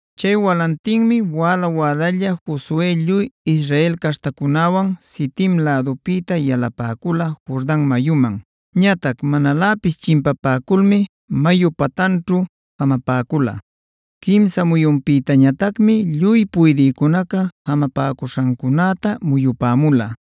Chay walantinmi wäla-wälalla Josue lluy Israel caśhtacunäwan Sitim lädupïta yalapäcula Jordan mayuman. Ñatac manaläpis chimpapäculmi mayu pantanćhu jamapäcula. Quimsa muyunpïtañatacmi lluy puydïcunaca jamapäcuśhancunäta muyupämula,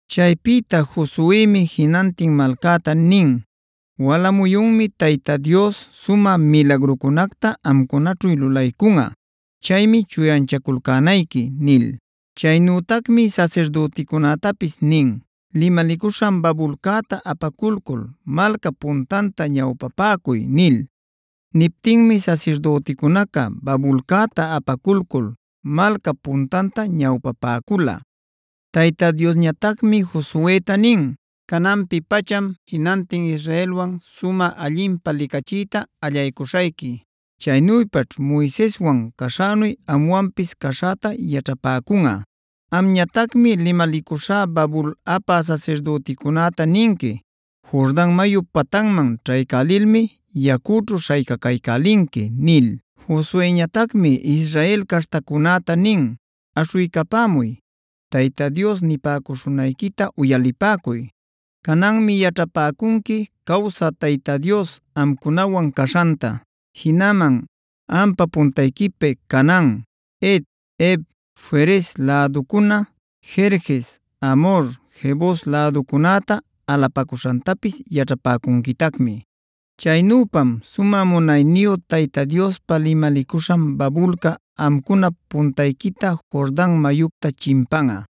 Chaypïta Josuemi jinantin malcäta nin: “Wala muyunmi Tayta Dios sumä milagrucunacta amcunaćhu lulaycunꞌa. Chaymi chuyanchaculcänayqui” nil. Chaynütacmi sasirdüticunätapis nin: “Limalicuśhan babulcäta apaculcul malcap puntanta ñawpapäcuy” nil. Niptinmi sasirdüticunaca babulcäta apaculcul malcap puntanta ñawpapäcula. Tayta Diosñatacmi Josueta nin: “Cananpi-pacham jinantin Israelwan sumä allinpä licachiyta allaycuśhayqui. Chaynüpaćh Moiseswan caśhänu amwanpis caśhäta yaćhapäcunꞌa. Amñatacmi limalicuśhá babul apä sasirdüticunäta ninqui: ‘Jordan mayup patanman ćhaycälilmi yacućhu śhaycaycälinqui’” nil. Josueñatacmi Israel caśhtacunäta nin: “Aśhuycapämuy; Tayta Dios nipäcuśhunayquita uyalipäcuy. Cananmi yaćhapäcunqui cawsä Tayta Dios amcunawan caśhanta. Jinaman ampa puntayquipi Canaan, Het, Hev, Ferez läducuna, Gerges, Amhor, Jebus läducunäta alapacuśhantapis yaćhapäcunquitacmi. Chaynüpam sumä munayniyu Tayta Diospa limalicuśhan babulca amcunap puntayquita Jordan mayucta chimpanꞌa.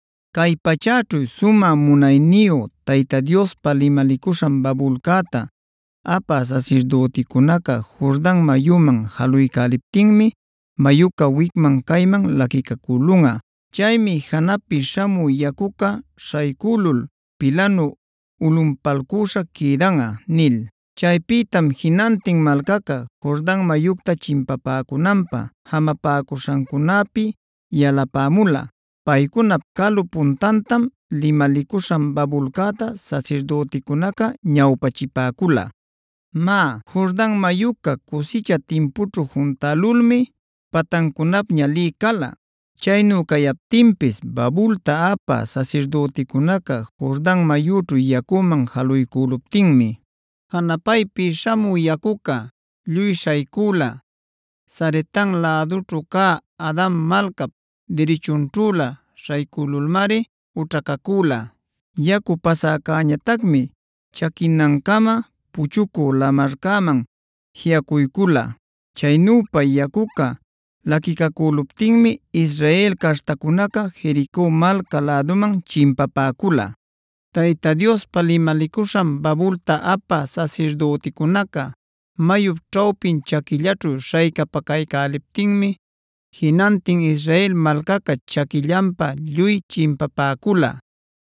Cay pachäćhu sumä munayniyu Tayta Diospa limalicuśhan babulcäta apä sasirdüticunaca Jordan mayüman jaluycäliptinmi mayuca wicman cayman laquicacülunꞌa. Chaymi janapi śhamü yacuca śhaycülul pilanu ulꞌunpalcüśha quïdanꞌa” nil. Chaypïtam jinantin malcaca Jordan mayucta chimpapäcunanpä jamapäcuśhancunapi yalapämula. Paycunap calu puntantam limalicuśhan babulcäta sasirdüticunaca ñawpachipäcula. Má, Jordan mayuca cusicha timpućhu juntälulmi patancunapña lï cala. Chaynu cayaptinpis babulta apä sasirdüticunaca Jordan mayućhu yacüman jaluycüluptinmi, janapaypï śhamü yacuca lluy śhaycüla. Saretan lädućhu cä Adam malcap dirichunćhüla śhaycülulmari ućhacacüla. Yacu pasäcäñatacmi chaquinancama Puchucü Lamarcäman jiꞌacuycula. Chaynüpa yacuca laquicacüluptinmi Israel caśhtacunaca Jerico malca läduman chimpapäcula. Tayta Diospa limalicuśhan babulta apä sasirdüticunaca mayup ćhawpin chaquillaćhu śhaycapacaycäliptinmi jinantin Israel malcaca chaquillanpa lluy chimpapäcula.